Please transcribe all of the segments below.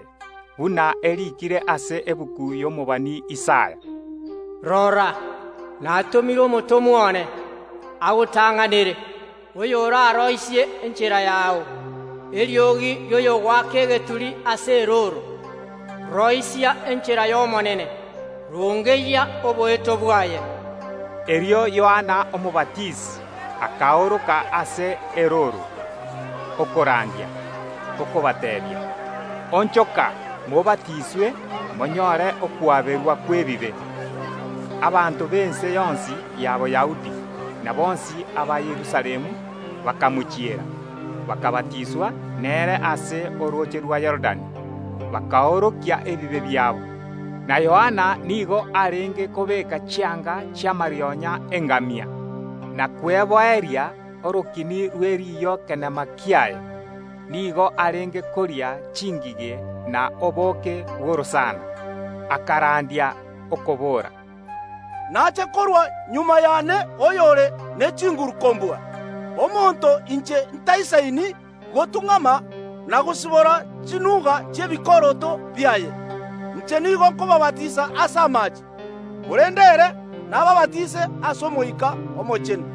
nigo yachaagete buna eriikire ase egetabu y’omobani Isaya. “Nyasae agateeba,” rora, natomire omotomwa one agotang’anere, oyo oraroisie enchera yao; eriogi ri’omonto ogoaka egeturi ase erooro: Roisia enchera y’Omonene, rongeyia oboeto bwaye! Erio Yohana Omobatisi akaoroka ase erooro, okorandia, okobateebia, “Onchoka, mobatiswe, monyore okwaberwa kw’ebibe.” Abanto b’ense yonsi ya Boyahudi, na bonsi aba Yerusalemu bakamochiera, bakabatiswa nere ase orooche rwa Yorodani, bakoorokia ebibe biabo. Na Yohana nigo arenge kobeeka chianga chi’amarionya y’engamia, na kweboeria orokini rwe riiyo kenema kiaye. Nigo arenge koria chingige n’obooke bw’orosana. Akarandia, okobora, “Nache korwa magega y’ane oyore ne chinguru kombua, oyio inche ntaisaini gotung’ama na gosibora chiusi chi’ebikoroto biaye. Inche nigo nkobaabatisa ase amaache, korende ere nabaabatise ase Omoika Omochenu.”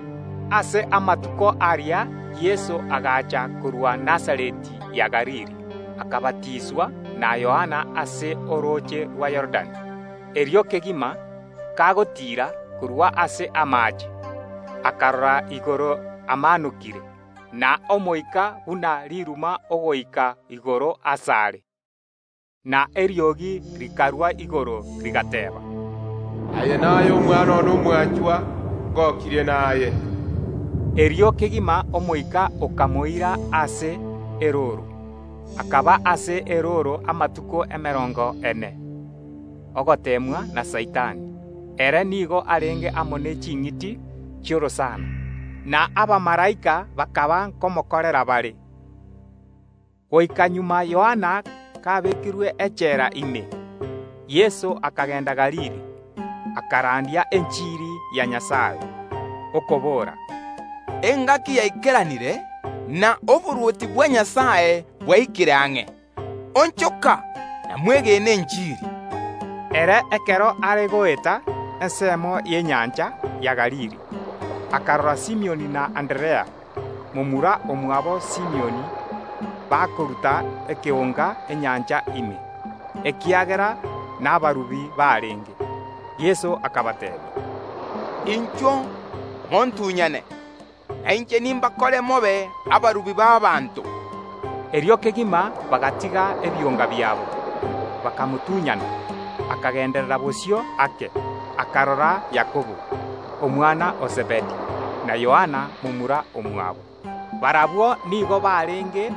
Ase amatuko aria Yeso agacha korwa Nazareti ya Galili, akabatiswa na Yohana ase orooche rwa Yorodani. Erio kegima, Yeso kagotiira korwa ase amaache, akarora igoro amaanokire, na Omoika buna riruma ogoika igoro asare, na eriogi rikarwa igoro, rigateeba, “Aye naye Omwana one omwanchwa, ngokirie naye.” Erio kegima Omoika okamoira ase erooro. Akaba ase erooro amatuko emerongo ene, ogoteemwa na Saitani; ere nigo arenge amo ne ching’iti chi’orosana; na abamalaika bakaba nkomokorera bare. Magega Yohana kabekirwe echela ime, Yeso akagenda Galili, akarandia enchiri ya Nyasae, okobora, “Engaki yaikeranire, na oborwoti bwa Nyasae bwaikire ang’e; onchoka na mwegene enchiri.” Ekero Yeso are goeta ensemo y’enyancha ya Galili, akarora Simioni na Anderea, momura omwabo Simioni, bakoruta ekeonga enyancha ime, ekiagera nabarubi barenge. Yeso akabateebia, “Inchuo montunyane, na inche nimbakore mobe abarubi b’ abanto.” Erio kegima bagatiga ebionga biabo, bakamotunyana. Akagenderera bosio ake, akarora Yakobo, omwana o Zebedi, na Yohana momura omwabo; barabwo nigo barenge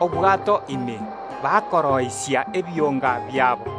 obwato ime bakobareera ebionga biabo.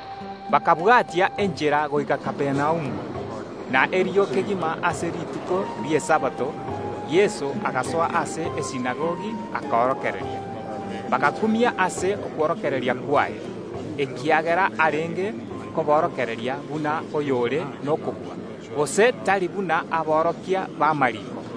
Bakabwatia enchera goika Kapernaumu, na erio kegima ase rituko ri’Esabato Yeso agasoa ase esinagogi akorokereria. Bagakumia ase okworokereria kwaye, ekiagera arenge koborokereria buna oyore nokobua, gose tari buna aborokia b’amariiko.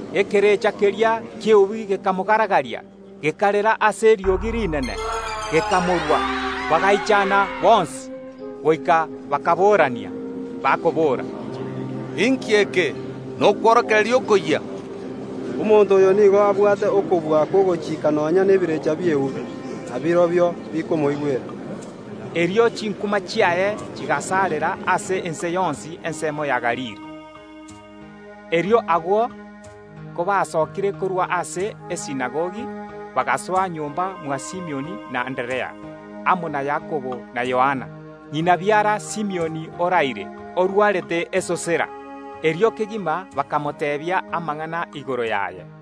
Ekerecha keria ki’eubi gekamogaragaria, gekarera ase eriogi rinene, gekamorwa. Bagaichana bonsi, goika bakaborania, bakobora, “Inki eke? Nokworokereria okoyia! Omonto oyo nigo abwate okobua kw’ogochika nonya nebirecha bi’eubi, na birobio bikomoigwera.” Erio chinkuma chiaye chigasarera ase chinsinyo chionsi chi’ense ya Galili. Erio agwo kobasokire korwa ase esinagogi, bakagenda goika nyomba mwa Simioni na Anderea: Yakobo na Yohana bakagenda nere. Ng’ina biara Simioni nigo araire, arwarete esosera. Erio kegima Yeso gaikire bakamoteebia amang’ana igoro yaye.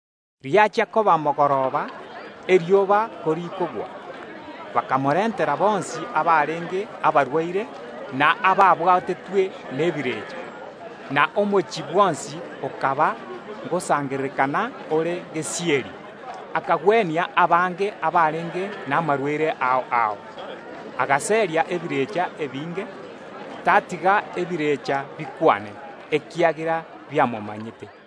Riachia koba mogoroba, erioba korikogwa, abanto bakarentera Yeso abarwaire bonsi, na ababwatire nebirecha. Na omochie bwonsi okaba ngosangererekana ore gesieri. Yeso akagwenia abange abarenge namarwaire ao ao, na agaseria ebirecha ebinge; tatiga ebirecha bikwane, ekiagera biamomanyete.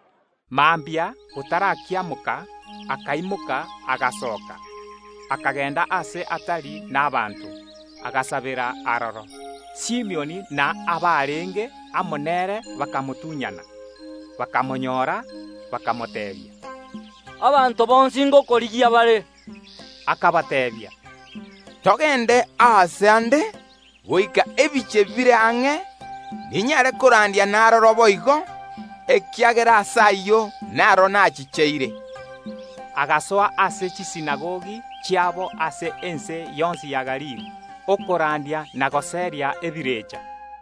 Mambia, botarakiamoka, akaimoka, agasooka, akagenda aase atari nabaanto, agasabera aroro. Simioni na abarenge amo nere bakamotunyana, ekero bamonyorete, bakamoteebia, “Abanto bonsi ngokorigia bare.” Yeso akabateebia, “Togende aase aande goika ebinyoro bire ang’e, ninyare korandia na aroro boigo, ekiagera ase ayio naro nachicheire.” Agasoa ase chisinagogi chiabo ase ense yonsi ya Galili, okorandia na goseria ebirecha.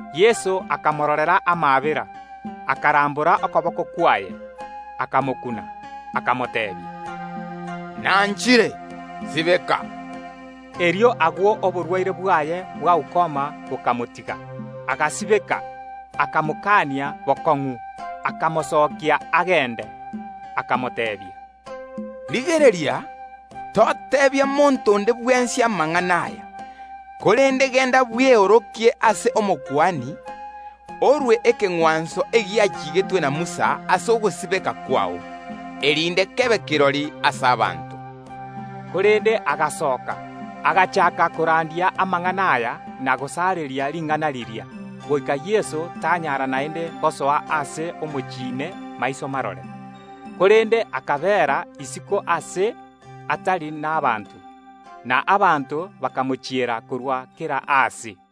Yeso akamororera amaabera, akarambora okoboko kwaye, akamokuna, akamoteebia, “Nanchire; sibeka.” Erio agwo oborwaire bwaye bwa ukoma bokamotiga, agasibeka. Akamotianera bokong’u, kamosokirie agende, akamoteebia, “Rigereria, toteebia monto onde bwensi amang’ana aya; korende genda bweorokie ase Omokuani, orue ekeng’wanso egiachigetwe na Musa ase ogosibeka kwao, erinde kebe kirori ase abanto.” Korende agasoka, agachaaka koraria amang’ana aya na gosareria ring’ana riria, goika Yeso tanyara naende gosoa ase omochie ime maiso marore, korende akabeera isiko aase atari nabaanto; na abanto bakamochiera korwa kera aase.